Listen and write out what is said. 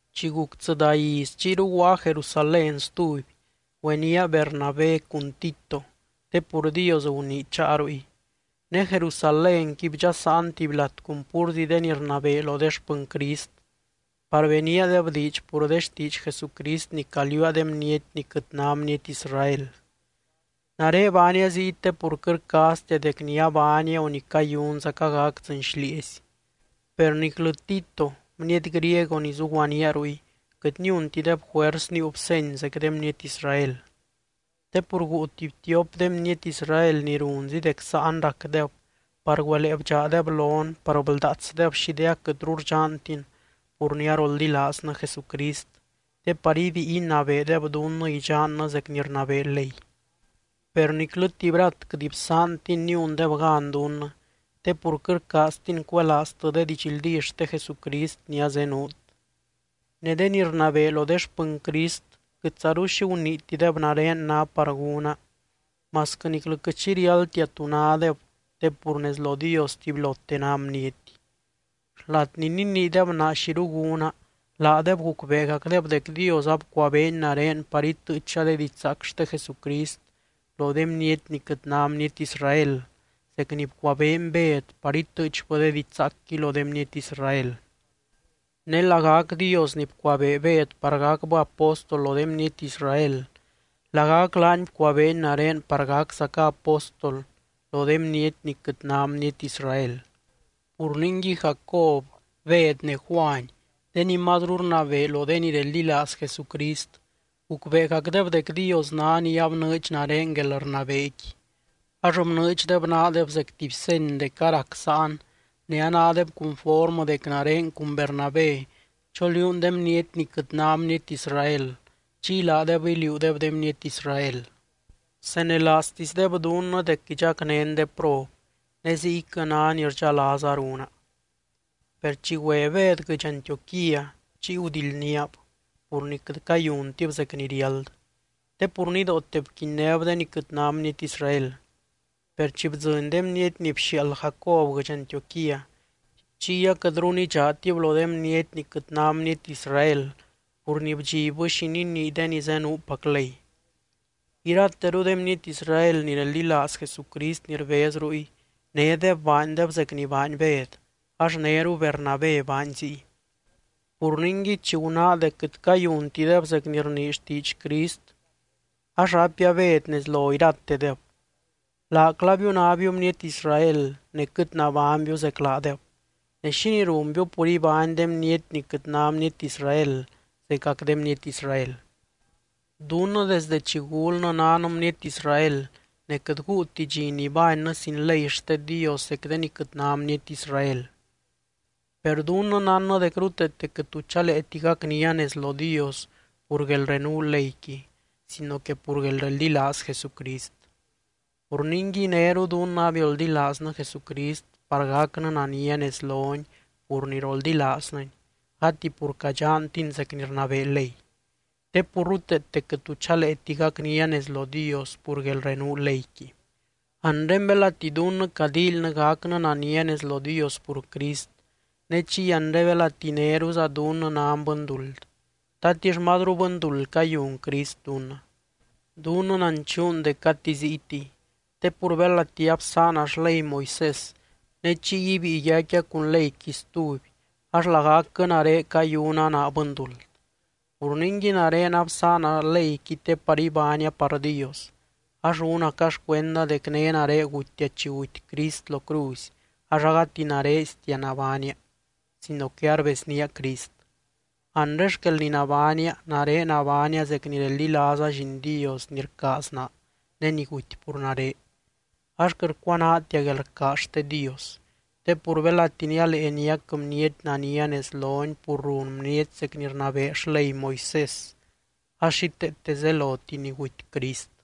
Chi guc tsɨdá iz, chiyru guaa Jerusalén stuby. Güenía Bernabé cun Tito te pur Dios gunii cháa ruy. Ne Jerusalénqui bdxasaan tuby lat cun púrzi de ni rnabee lo de xpɨny Crist par beníadeb diidx pur de xtiidx Jesucrist ni caliuua de bniety ni quɨt ná bniety Israel. Nare baania ziy te pur quɨt rcaaztia dec ni abaania o ni cayunzaca gac dzɨɨny xlieezy. Per niclɨ Tito bniety griego ni zuguaníaa ruy, quɨt niuntideb juers níiub seny zec de bniety Israel. Te pur guu tuby tiop de bniety Israel ni runzi dec sáan racdeb par güelee bdxaadeb lon par bldaatsdeb xi de aquɨtru rdxantin pur ni aroldilaaznɨ Jesucrist te par ibíi inabeedeb dunnɨ idxannɨ zec ni rnabee ley. Per niclɨ tuby rat quɨt bsaantin niundeb gan dunnɨ, te pur quɨt rcaaztin cuelaaztɨ de didxldí xte Jesucrist ni azenuut. Ne de ni rnabee lo de xpɨny Crist quɨtzaru xi guniitideb nare ná par gúna masquɨ niclɨ quɨt xi riáldtia tú nádeb te pur nez lo Dios tubylote ná bniety. Xlat ni niniideb naa xiru gúna, laadeb gucbeegacdeb dec Dios abcuabeeny nare par itɨɨcha de didxzaac xte Jesucrist lo de bniety ni quɨt ná bniety Israel, zec ni bcuabeeny Bed par itɨɨchbɨ de didxzaacqui lo de bniety Israel. (Ne lagac Dios ni bcuabee Bed par gacbɨ apóstol lo de bniety Israel, lagac laany bcuabeeny nare par gaczaca apóstol lo de bniety ni quɨt ná bniety Israel.) Pur ningui, Jacob, Bed ne Juany de ni mazru rnabee lo de ni reldilaaz Jesucrist, gucbeegacdeb dec Dios ná ni abnɨɨdx nare guelrnabeequi. Ax bnɨɨdxdeb naadeb zec tuby seny dec a rac sáan ne anádeb cunformɨ dec nare cun Bernabé choliuun de bniety ni quɨt ná bniety Israel. Chiy laadeb iliuudeb de bniety Israel. Bsenelaaztisdeb dunnɨ dec idxacnén de prob ne ziyquɨ ná ni rdxalaaza runa. Per chi güe Bed guɨdx Antioquía, chiy gudildníab pur quɨt cayuntib zec ni riáld te pur nidoote bquinnéb de ni quɨt ná bniety Israel. Per chi bdzɨny de bniety ni bxiaald Jacob guɨdx Antioquía, chiy aquɨtru nidxaatib lo de bniety ni quɨt ná bniety Israel pur ni bdxibbɨ xi ninii de ni zenuupac ley. Irateru de bniety Israel ni reldilaaz Jesucrist ni rbez ruy nédeb baandeb zec ni baany Bed ax néru Bernabé baany ziy. Pur ningui, chi gunáa dec quɨt cayuntideb zec ni rnii xtiidx Crist ax raipia Bed nez lo iratedeb: “Laclaabiu nábiu bniety Israel ne quɨt nabánybiu zec laadeb ne, ¿xínii runbiu pur ibány de bniety ni quɨt ná bniety Israel zecac de bniety Israel? ’Dunnɨ desdɨ chi gulnɨ nan bniety Israel ne quɨt guuti dxi nibánnɨ sin ley xte Dios zec de ni quɨt ná bniety Israel. Per dunnɨ nánnɨ dec ruteete quɨt tu chaleeti gacnia nez lo Dios pur guelrenuu leyqui sino que pur guelreldilaaz Jesucrist. Pur ningui néru dunnɨ abioldilaaznɨ Jesucrist par gacnɨ nania nez lony pur ni roldilaaznɨny, gati pur cadxantin zec ni rnabee ley. Te pur ruteete quɨt tu chaleeti gacnia nez lo Dios pur guelrenuu leyqui. ’Anre belati dunnɨ cadíilynɨ gacnɨ nania nez lo Dios pur Crist, ne chiy anre belati néruza dunnɨ nan bɨnduld, ¿tatix mazru bɨnduld cayun Crist dunnɨ? Dunnɨ nanchuun dec gati ziytiy te pur belati absaana xley Moisés ne chiy ibíi yaicquia cun leyqui stuby ax lagacquɨ nare cayuna naa bɨnduld. Pur ningui nare absaana leyqui te par ibánia par Dios. Ax rúnaca xcuenda dec né nare gutia chi guty Crist lo cruzy ax agati narestia nabánia, sino que arbeznía Crist. Anre xquel ni nabánia, nare nabánia zec ni reldilaaza Lliin Dios ni rcaaz naa ne ni guty pur nare. Ax quɨt rcuanaatia guelrcaaz xte Dios; te pur belati nialee niac bniety nania nez lony pur run bniety zec ni rnabee xley Moisés ax xíteete zeloti ni guty Crist.”